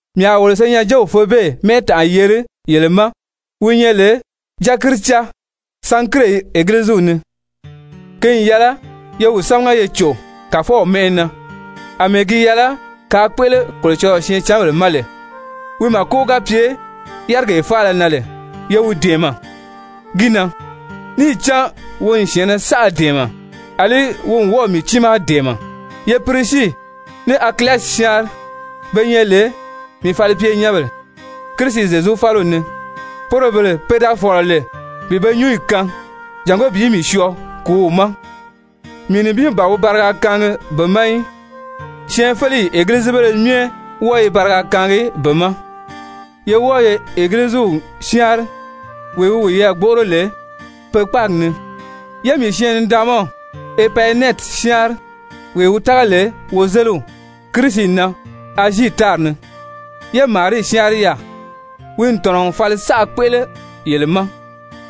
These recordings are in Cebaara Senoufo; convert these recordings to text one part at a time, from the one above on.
Mii a wolo senyɛnjew Febe mɛ́ɛtanʔa yeri yele ma wi nyɛ lè dyakiricaa Sankire Egiliziw ni. Ki n yɛlɛ ye wi sámaga ye cò Kàfɔw mɛ́ʔɛ na, àmɛɛ gi yɛlɛ kaa kpéʔele Kolocɔlɔɔ syɛɛncanbèle ma lè. Wi màko ga pye yárigee faala na lè, ye wi dɛ̀ɛmɛ gi na, níì cán wi n syɛ̀ɛnnɛ saʔa dɛ̀ɛmɛ, àlí wi n wɔ́ɔ̀ mii tiimaa dɛ̀ɛmɛ. Ye Pirisii ní Akilasi syáanri, be nyɛ lè mii falipyenyɛnbèle Kirisi Zyezu fáliw ni, poro bele pe da fɔ̀lɔ lè bi be nyúnyi kaan jàngó bi mii syɔɔ kùúw ma. Mii nibin ban wi bariga kaangi be ma í, syɛɛnfeleyi egilizibéle myɛ wɔ́ɔ i bariga kaangi be ma. Ye wɔ́ɔ ye Egiliziw syáanri wee wi wiyɛɛ gbóʔoro lè pe kpáagi ni. Ye mii syɛɛn-nidaanmaw Epayinɛti syáanri, wee wi tága lè wozeliw Kirisi na Azii tári ni. Ye Marii syáanri yaà, wi n tɔ̀nɔ n fali saʔa kpéʔele yele ma.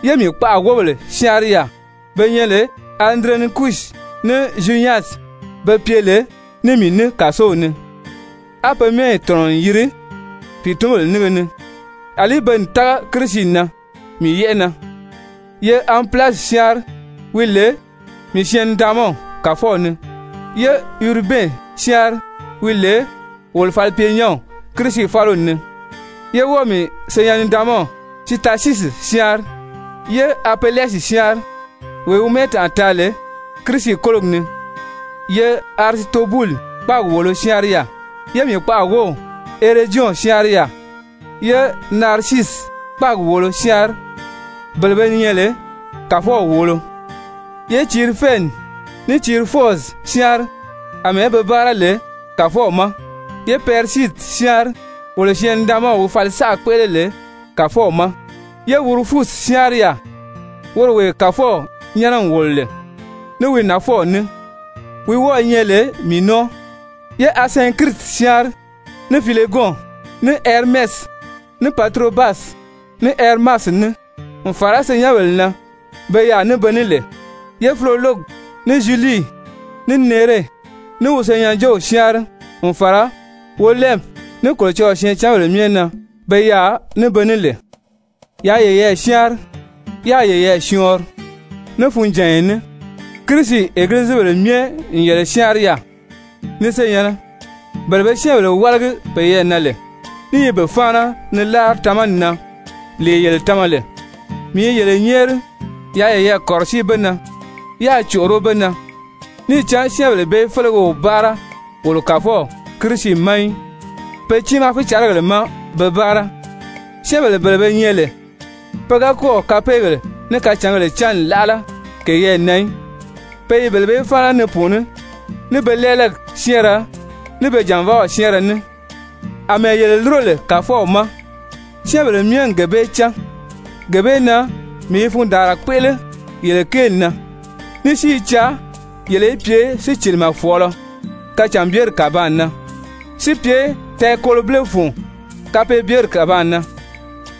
Ye mii kpaʔa wóbèle syáanri yaà, pe nyɛ lè Anduronikusi ní Zyunyasi, pe pye lè ní mii ní kàsow ni, á pe mɛ́ɛyi tɔ̀nɔ n yiri pìitunbèle nínge ni, àlí pe n tága Kirisi na mii yɛ́ʔɛ na. Ye Anpilasi syáanri wi lè mii syɛɛn-nidaanmaw Kàfɔw ni. Ye Uribɛn syáanri wi lè wolo falipyenyɛnw Kirisi fáliw ni, yé wɔ́ɔ mii syɛɛn-nidaanmaw Sitasyisi syáanri. Ye Apelɛsi syáanri, wee wi mɛ́ɛtanʔa taa lè Kirisi kólogi ni. Ye Arisitobuli kpáagi wòolo syáanri yaà. Ye mii kpaʔa wów Herodyɔn syáanri yaà. Ye Narisiisi kpáagi wòolo syáanri, bele be nyɛ lè Kàfɔw wòolo. Ye Tirifɛni ní Tirifɔzi syáanri, àmɛɛ be báara lè Kàfɔw ma. Ye Pɛrisidi syáanri, wolo syɛɛn-nidaanmaw wi fali saʔa kpéʔele lè Kàfɔw ma. Ye Wurufusi syáanri yaà, woro wee Kàfɔw nyɛ́nɛ n wòlo lè, ní wi nafɔw ní, wi wɔ́ɔ̄ nyɛ lè mii nɔ́ɔ. Ye Asɛnkiriti syáanri, ní Filegɔn, ní Hɛrimɛsi, ní Paturobasi, ní Hɛrimasi ní, n fàra senyɛnbèle na be yaà ní be ní lè. Ye Filologi ní Zyulii, ní Nere, ní wi senyɛnjew syáanri n fàra Wolɛnpi, ní Kolocɔlɔɔ syɛɛncanbèle myɛ na be yaà ní be ní lè. Yaa yeyɛɛ syáanri, yáā yeyɛɛ syɔɔnri ní funjànya ní. Kirisi egilizibèle myɛ n yele syáanri yaà. Ni senyɛ̀nnɛ, bele be syɛ́ɛnbèle wálagi peyɛɛ na lè, ní i be fáana ni láari tamani na, lee yele tama lè, mii i yele nyɛ́ɛri yaa yeyɛɛ kɔ̀rɔsíi be na. Yaa còʔoró be na. Níì cán syɛ́ɛnbèle bee félege o báara wolo Kàfɔw Kirisi ma í, pe tiimaa fícarigèle má be báara. Syɛ́ɛnbèle bele be nyɛ lè pe ga kɔ́ɔ̀ kapeegèle ní kacǎngèle cán n láʔala keyɛɛ na í, pe i bele bee fáana ni pùuní ní be lɛ́ɛlɛgi syɛ́ɛnrɛ, ní be jànvaaw syɛ́ɛnrɛ ní. Amɛɛ yele lúro lè Kàfɔw ma, syɛ́ɛnbèle myɛ n gee bee cán. Gee bee na mii i fundaanra kpéʔele yele kéeli na, ní si i caa yele í pye sícilimɛ fɔ̀ɔlɔ kacànbyeri kàbaan na, si pye tɛɛkolobile fun kapeebyeri kàbaan na.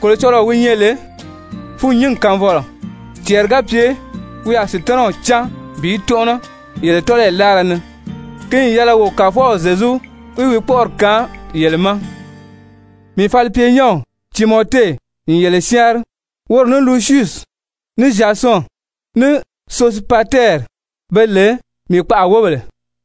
Kolocɔlɔɔ wi nyɛ lè fûnnyingi kaanfɔlɔ, cɛɛri ga pye wi a Sutanaw cáan bi tɔ́nʔɔnɔ yele tɔ́lɔyi láara ni. Ki n yɛlɛ wo Kàfɔw Zyezu í wi kpɔ́ʔɔri kaan yele ma! Mii falipyenyɛnw Timɔte n yele syáanri, woro ní Lusyusi, ní Zyasɔn, ní Sosipatɛri be lè mii kpaʔa wóbèle.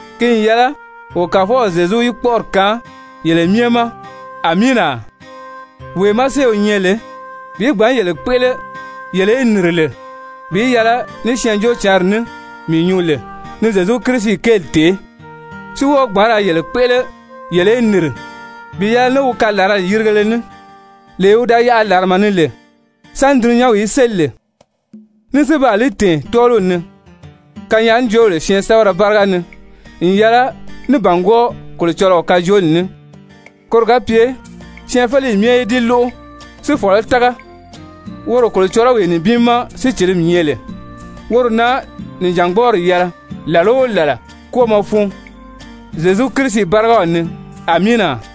[Ki n yɛlɛ wo Kàfɔw Zyezu í wi kpɔ́ʔɔri kaan yele myɛ ma! Amiina!] Wee má séew nyɛ lè bi gbǎn yele kpéʔele yele í nìri lè bi yɛlɛ ní Syɛɛnjóocǎnri ní mii nyuu lè ni Zyezu Kirisi kéeli tèé, si wɔ́ɔ gbǎn yele kpéʔele yele í nìri bi yɛlɛ ní wi kalarali yirigele ní, lee wi da yaʔa làrama ni lè sáni dulunyanw í séli lè, ní si baa li tɛ̀ɛn tɔ́ɔliw ni kanyaajoobèle syɛɛnsɛbɛrɛ báriga ni n yɛlɛ ní bàngwɔɔ Kolocɔlɔɔ kajooli ní, koro ga pye syɛɛnfeleyi myɛ í di lóʔo si fɔ̀lɔ́ tága, woro Kolocɔlɔwee nibin má sícilimi nyɛ lè, woro na nìjangbɔɔri yɛlɛ làla o làla kwɔ́ɔmɔ fun Zyezu Kirisi bárigaw ni! Amiina!